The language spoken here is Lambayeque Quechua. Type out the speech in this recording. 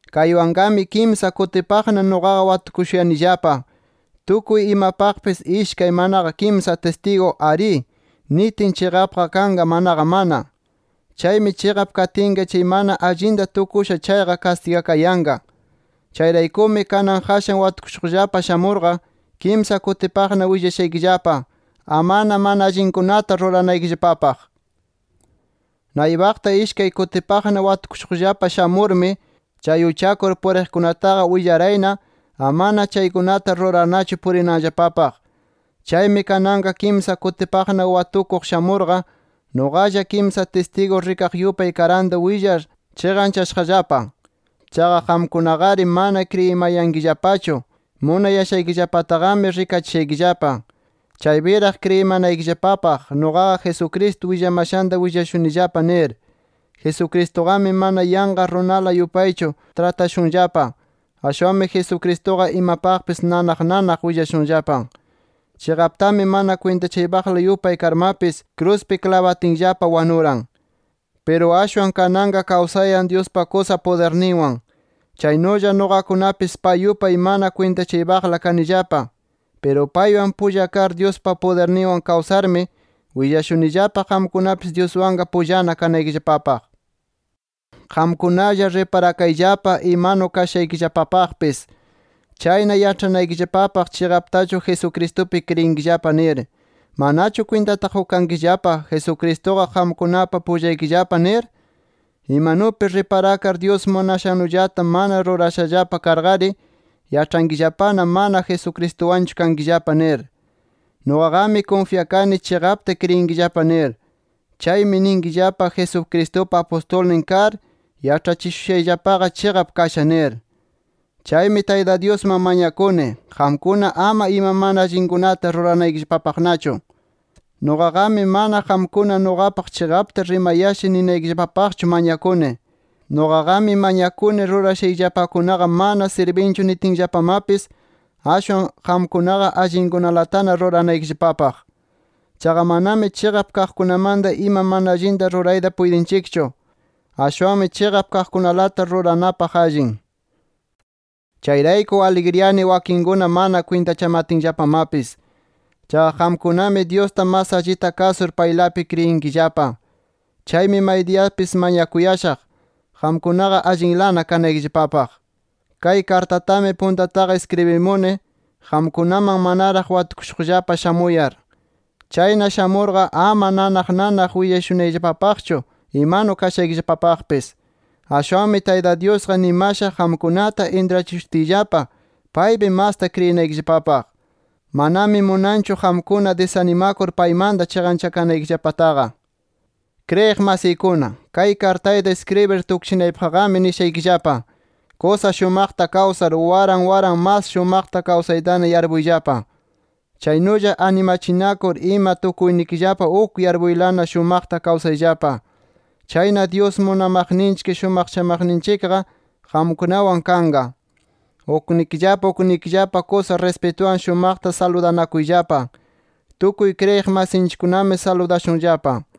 Kaywanqami kimsa kutipaqna nuqaqa watukushuyanillapa. Tukuy imapaqpis ishkay manaqa kimsa tistigu “Arí” nitin chiqapqa kanqa, manaqa mana. Chaymi chiqap katinqa chay mana allinta tukusha chayqa kastigakayanqa. Chayraykumi kanan qashan watukushuqllapa shamurqa, kimsa kutipaqna willashaykillapa amana mana allinkunata ruranaykillapapaq. Naypaqta ishkay kutipaqna watukushuqllapa shamurmi, chay uchakur puriqkunataqa willarayna amana chaykunata rurarnachu purinanllapapaq. Chaymi kanan kimsa kutipaqna watukuq shamurqa, nuqalla kimsa tistigu rikaq yupay karanta willar chiqanchashaqllapa. Chaqa qamkunaqari mana kriyimayankillapachu. Munayashaykillapataqami rikachishaykillapa, chaypiraq kriyimanaykillapapaq, nuqaqa Jesucristo willamashanta willashunillapa nir. Jesucristuqami mana yanqa runala yupaychu tratashunllapa. Ashwanmi Jesucristuqa imapaqpis nanaq nanaq willashunllapa. Chiqaptami mana kwintachakaypaqla yupay karmapis, kruspi klabatinllapa wanuran. Piru ashwan kananqa kawsayan Dyuspa kusa pudirninwan. Chaynulla nuqakunapis pay yupay mana kwintachaypaqla kanillapa. Piru paywan pulla kar Dyuspa pudirninwan kawsarmi, willashunillapa qamkunapis Dyuswanqa pullana kanaykillapapaq. Qamkunalla riparakayllapa imanu kashaykillapapaqpis. Chayna yaĉhanaykillapapaq chiqaptachu Jesucristupi kriyinkillapa nir. ¿Manachu kwintata qukankillapa Jesucristuqa qamkunapa pullaykillapa nir? Imanupi riparakar Dyus munashannullata mana rurashallapa karqari, yaĉhankillapana mana Jesucristuwanchu kankillapa nir. Nuqaqami kunfyakani chiqapta kriyinkillapa nir. Chaymi ninkillapa, Jesucristupa apustulnin kar yaĉhachishushayllapaqa chiqap kasha nir. Chaymi Tayta Dyusman mañakuni, qamkuna ama ima mana allinkunata ruranaykillapapaqnachu. Nuqaqami mana qamkuna nuqapaq chiqapta rimayasha ninaykillapapaqchu mañakuni. Nuqaqami mañakuni rurashayllapakunaqa mana sirbinchu nitinllapamapis, ashwan qamkunaqa allinkunalatana ruranaykillapapaq. Chaqa manami chiqap kaqkunamanta ima mana allinta rurayta puytinchikchu. Ashwanmi chiqap kaqkunalata ruranapaq allin. Chayrayku aligriyani wakinkuna mana kwintachamatinllapamapis. Chaqa qamkunami Dyusta mas allita kasur paylapi kriyinkillapa. Chaymi maydiyapis mañakuyashaq, qamkunaqa allinlana kanaykillapapaq. Kay kartatami puntataqa iskribimuni qamkunaman manaraq watukushuqllapa shamuyar. Chayna shamurqa, ama nanaq nanaq willashunayllapapaqchu imanu kashaykillapapaqpis. Ashwanmi Tayta Dyusqa nimasha qamkunata intrachishutiyllapa paypi masta kriyinaykillapapaq. Manami munanchu qamkuna disanimakur paymanta chiqanchakanaykillapataqa. Kriyiq masiykuna, kay kartayta iskribir tukchinaypaqqami nishaykillapa: Kusa shumaqta kawsar, waran waran mas shumaqta kawsaytana yarpuyllapa. Chaynulla animachinakur ima tukuynikillapa uk yarpuylana shumaqta kawsayllapa. Chayna Dyus munamaqninchik, shumaqchamaqninchikqa qamkunawan kanqa. Uknikillapa uknikillapa kusa rispituwan shumaqta saludanakuyllapa. Tukuy kriyiq masinchikkunami saludashunllapa.